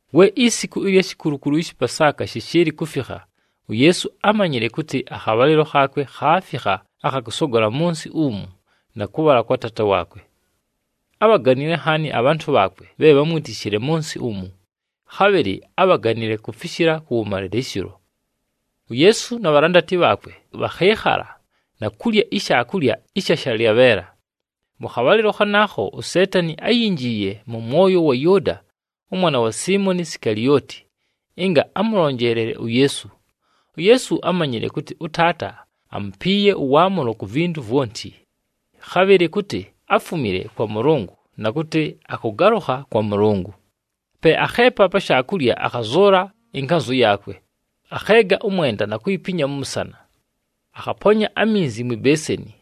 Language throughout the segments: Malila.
We isiku ɨlya shikulukulu ɨshɨ Pasaaka shɨshɨɨlɨ kufikha, uYeesu ámanyile kʉtɨ akhabhalɨlo khaakwe khaafikha akha kʉsogola mʉ nsɨ umu na kʉbhala kwa Taata waakwe. Ábhaganile nhaani abhantʉ bhaakwe bhe bhámwitishile mʉ nsɨ umu, khabhɨlɨ ábhaganile kufishila kʉwʉmalɨlɨshɨlo. UYeesu na bhalandati bhaakwe bhakhɨɨkhala na kulya ishaakulya ɨsha shalyabheela. Mʉ khabhalɨlo khanaakho, uSeetani áyinjiiye mʉ mwoyo wa Yʉʉda ʉmwana wa Siimoni Sikalioti ɨnga amʉlonjeelele uYeesu. UYeesu ámanyile kʉtɨ ʉTaata amupiiye ʉwaamʉlo ku vintu vwonti, khabhɨlɨ kʉtɨ áfumile kwa Mʉlʉngʉ na kʉtɨ akʉgalʉkha kwa Mʉlʉngʉ. Pe akheepa pa shaakulya, akhazʉʉla ɨnkanzʉ yaakwe, akheega ʉmwenda na kuyipinya mʉ mʉsana. Akhaponya aminzi mwi beeseni.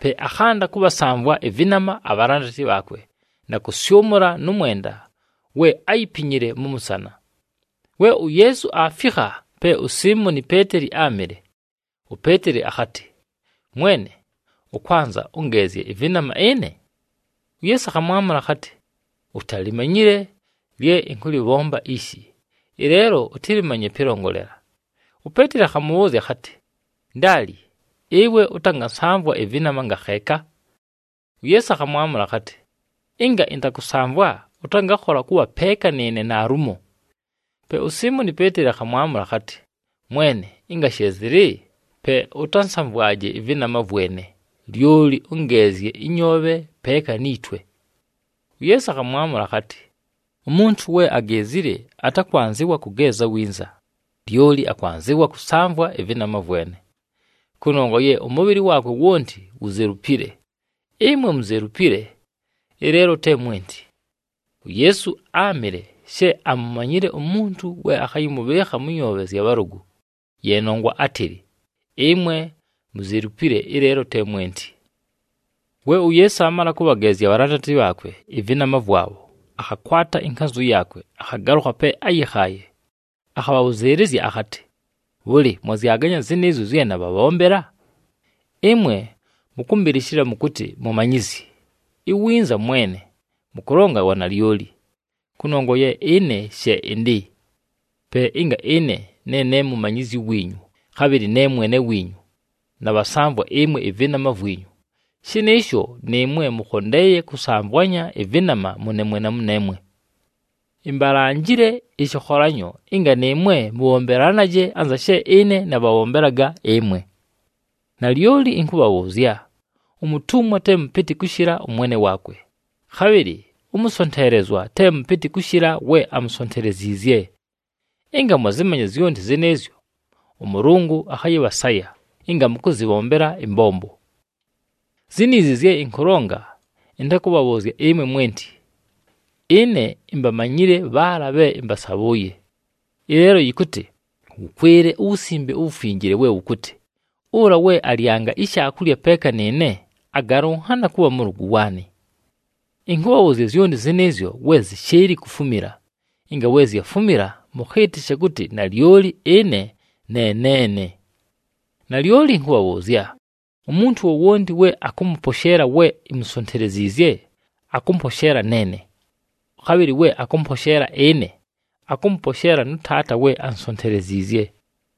Pe akhanda kʉbhasamvwa ɨvɨnama abhalandati bhaakwe na kʉsyʉmʉla nʉ mwenda we áyipinyile mʉ mʉsana. We uYeesu aafikha pe uSiimoni Peeteli áamɨle, uPeeteli akhatɨ, “Mwene, ʉkwanza ʉngeezye ɨvɨnama ɨne?” UYeesu akhamwamʉla akhatɨ, “Utalimanyile lye ɨnkʉlɨbhomba ishi, ɨleelo ʉtɨlɨmanye pɨlongolela.” UPeeteli akhamʉbhʉʉzya akhatɨ, “Ndaali, ɨwe ʉtangansamvwa ɨvɨnama ngakheeka!” UYeesu akhamwamʉla akhatɨ, “Ɨnga ɨntakʉsamvwa, ʉtangakhola kʉbha peeka nɨɨne naalumo.” Pe uSiimoni Peeteli akhamwamʉla akhatɨ, “Mwene, ɨnga she zɨlɨ, pe ʉtansamvwaje ɨvɨnama vwene, lyoli ʉngeezye ɨnyoobhe, peeka ni twe.” UYeesu akhamwamʉla akhatɨ, “Umuntu we ageezile atakwanzɨwa kʉgeeza winza, lyoli akwanzɨwa kʉsamvwa ɨvɨnama vwene, kʉnongwa ye ʉmʉbhɨlɨ waakwe wonti wuzelupile. Ɨmwe muzelupile, ɨleelo te mwenti.” UYeesu áamɨle she amumanyile umuntu we akhayɨmʉbhɨɨkha mʉ nyoobhe zya bhalʉgʉ, ye nongwa átɨlɨ, “Ɨmwe muzelupile, ɨleelo te mwenti.” We uYeesu aamala kʉbhageezya abhalandati bhaakwe ɨvɨnama vwabho, akhakwata ɨnkanzʉ yaakwe, akhagalʉkha pe áyɨkhaaye, akhabhabhʉzɨɨlɨzya akhatɨ, “Bhʉlɨ, mwazyaganya zɨnɨɨzyo zye nabhabhombela? Ɨmwe mʉkʉmbɨlɨshɨla mʉkʉtɨ, ‘Mumanyizyi,’ iwinza, ‘Mwene.’ Mʉkʉlonga wanalyoli, kʉnongwa ye ɨne she ɨndɨ. Pe ɨnga ɨne ne ne Mumanyizyi wiinyu, khabhɨlɨ ne Mwene wiinyu, nabhasamvwa ɨmwe ɨvɨnama vwinyu, shɨnɨɨsho nɨɨmwe mʉkhondeeye kʉsamvwanya ɨvɨnama mʉneemwe na mʉneemwe. Imbalanjile ɨshɨkholanyo, ɨnga nɨɨmwe mʉbhombelanaje anza she ɨne nabhabhombelaga ɨmwe. Nalyoli ɨnkʉbhabhʉʉzya, umutumwa te mʉpɨtɨ kʉshɨla ʉmwene waakwe, khabhɨlɨ ʉmʉsonteelezwa te mʉpɨtɨ kʉshɨla we amusonteleziizye. Ɨnga mwazɨmanya zyonti zɨnɨɨzyo, ʉMʉlʉngʉ akhayɨbhasaya ɨnga mʉkʉzɨbhombela ɨmbombo.” “Ziniizi zye ɨnkʉlonga, ɨntakʉbhabhʉʉzya ɨmwe mwenti. Ɨne imbamanyile bhaala bhe ɨmbasabhʉʉye. Ɨleelo yɨkʉtɨ wʉkwɨle uWusimbe uWufinjile we wʉkʉtɨ, ‘Ʉla we alyanga ishaakulya peeka nɨɨne, agalʉnhana kʉbha mʉlʉgʉ waanɨ.’ Ɨnkʉbhabhʉʉzya zyonti zɨnɨɨzyo we zɨshɨɨlɨ kufumila, ɨnga we zyafumila, mʉkhɨɨtɨshe kʉtɨ nalyoli ɨne ne neene. Nalyoli ɨnkʉbhabhʉʉzya, umuntu wowonti we akʉmʉposheela we imusonteleziizye, akʉmposheela neene. Khabhɨlɨ we akʉmposheela ɨne, akʉmʉposheela nʉ Taata we ansonteleziizye.”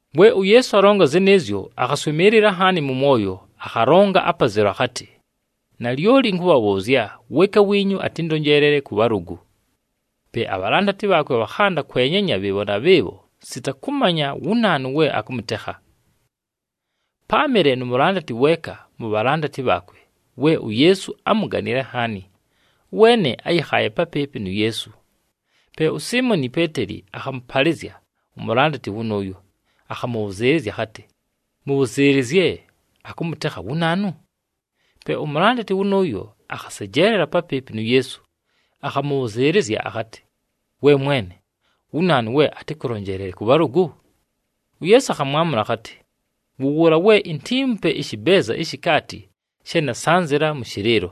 We uYeesu alonga zɨnɨɨzyo, akhaswɨmɨɨlɨla nhaani mʉ mwoyo, akhalonga apazelu akhatɨ, “Nalyoli ɨnkʉbhabhʉʉzya, weeka wiinyu atɨndonjeelele kʉ bhalʉgʉ.” Pe abhalandati bhaakwe bhakhanda kwenyanya bhɨɨbho na bhɨɨbho sita kʉmanya wu naanu we akʉmʉtekha. Páamɨle nu mulandati weeka mu bhalandati bhaakwe, we uYeesu ámuganile nhaani. Ʉweene áyɨkhaaye papɨɨpɨ nu Yeesu. Pe uSiimoni Peeteli akhamʉpalɨzya umulandati wʉnʉʉyo, akhamʉbhʉzɨɨlɨzya akhatɨ, “Mʉbhʉzɨɨlɨzye, akʉmʉtekha wu naanu?” Pe umulandati wʉnʉʉyo, akhasejeelela papɨɨpɨ nu Yeesu, akhamʉbhʉzɨɨlɨzya akhatɨ, “We Mwene, wu naanu we atɨkʉlonjeelele kʉ bhalʉgʉ?” UYeesu akhamwamʉla akhatɨ, “Wʉ wʉʉla we intiimupe ɨshɨbeeza ishi kaati she nasanzɨla mʉ shɨlɨɨlo.”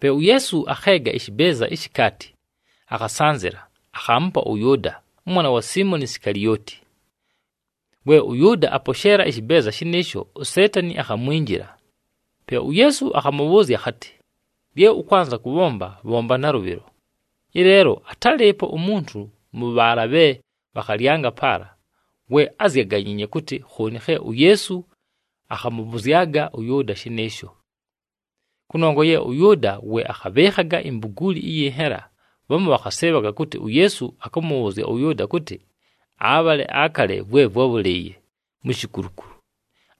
Pe uYeesu akheega ɨshɨbeeza ishi kaati, akhasanzɨla, akhaamupa ʉYʉʉda ʉmwana wa Siimoni Sikalioti. We ʉYʉʉda aposheela ɨshɨbeeza shɨnɨɨsho, uSeetani akhamwinjila. Pe uYeesu akhamʉbhʉʉzya akhatɨ, “Lye ʉkwanza kʉbhomba, bhomba nalʉbhɨlo!” Ɨleelo atálɨɨpo umuntu mʉ bhaala bhe bhakhalyanga paala we ázyaganyiinye kʉtɨ khooni khe uYeesu akhamʉbhʉzyaga ʉYʉʉda shɨnɨɨsho. Kʉnongwa ye ʉYʉʉda we akhabhɨɨkhaga imbuguuli ɨyɨ nhela, bhamu bhakhasɨɨbhaga kʉtɨ uYeesu akʉmʉbhʉʉzya ʉYʉʉda kʉtɨ abhale akale vwe vwábhʉlɨɨye mu shikulukulu,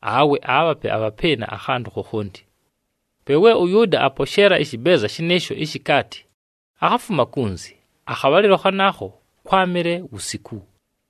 awe aabhape abhapɨɨna akhantʉ khokhonti. Pe we ʉYʉʉda aposheela ɨshɨbeeza shɨnɨɨsho ishi kaati, akhafuma kunzi. Akhabhalɨlo khanaakho kwámɨle wusiku.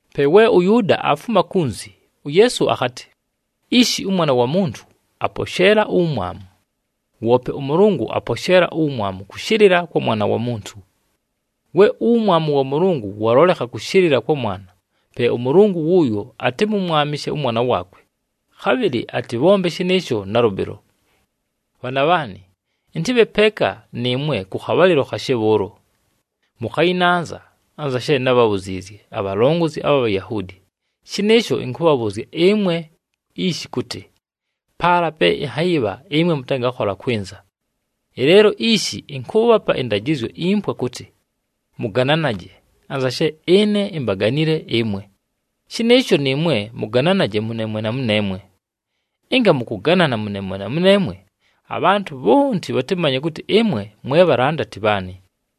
Pe we ʉYʉʉda aafuma kunzi, uYeesu akhatɨ, “Ishi ʉMwana wa Muntu aposheela uwumwamu, woope ʉMʉlʉngʉ aposheela uwumwamu kʉshɨlɨla kwa Mwana wa Muntu. We uwumwamu wa Mʉlʉngʉ walolekha kʉshɨlɨla kwa Mwana, pe ʉMʉlʉngʉ wʉʉyo atɨmʉmwamɨshe ʉMwana waakwe, khabhɨlɨ atɨbhombe shɨnɨɨsho nalʉbhɨlo. Bhaana bhaanɨ, ɨntɨbhe peeka nɨɨmwe kʉ khabhalɨlo khashe bhʉʉlo. Mʉkhayɨnanza, anza she nábhabhuziizye abhalongozi abha Bhayahuudi, shɨnɨɨsho ɨnkʉbhabhʉʉzya ɨmwe ishi kʉtɨ, paala pe ɨnhayɨbha ɨmwe mʉtangakhola kwɨnza. Ɨleelo ishi ɨnkʉʉbhapa ɨndajɨzyo impwa kʉtɨ, ‘Mʉgananaje, anza she ɨne imbaganile ɨmwe, shɨnɨɨsho nɨɨmwe mʉgananaje mʉneemwe na mʉneemwe.’ Ɨnga mʉkʉganana mʉneemwe na mʉneemwe, abhantʉ bhonti bhatɨmanye kʉtɨ ɨmwe mwe bhalandati bhaanɨ.”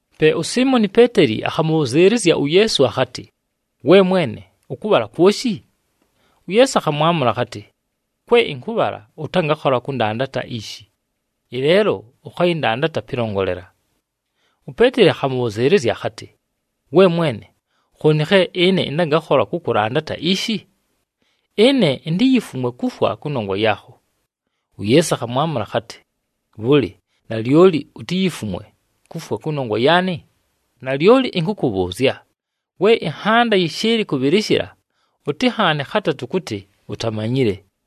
Pe uSiimoni Peeteli akhamʉbhʉzɨɨlɨzya uYeesu akhatɨ, “We Mwene, ʉkʉbhala kwoshi?” UYeesu akhamwamʉla akhatɨ, “Kwe ɨnkʉbhala ʉtangakhola kʉndandata ishi, ɨleelo ʉkhayɨndandata pɨlongolela.” UPeeteli akhamʉbhʉzɨɨlɨzya akhatɨ, “We Mwene, khooni khe ɨne ɨntangakhola kʉkʉlandata ishi? Ɨne intiyifumwe kufwa kʉnongwa yaakho!” UYeesu akhamwamʉla akhatɨ, “Bhʉlɨ, nalyoli utiyifumwe kufwa kʉnongwa yaanɨ? Nalyoli ɨnkʉkʉbhʉʉzya, we ɨnhanda yɨshɨɨlɨ kʉbhɨlɨshɨla, ʉtɨnhaane khatatʉ kʉtɨ utamanyile.”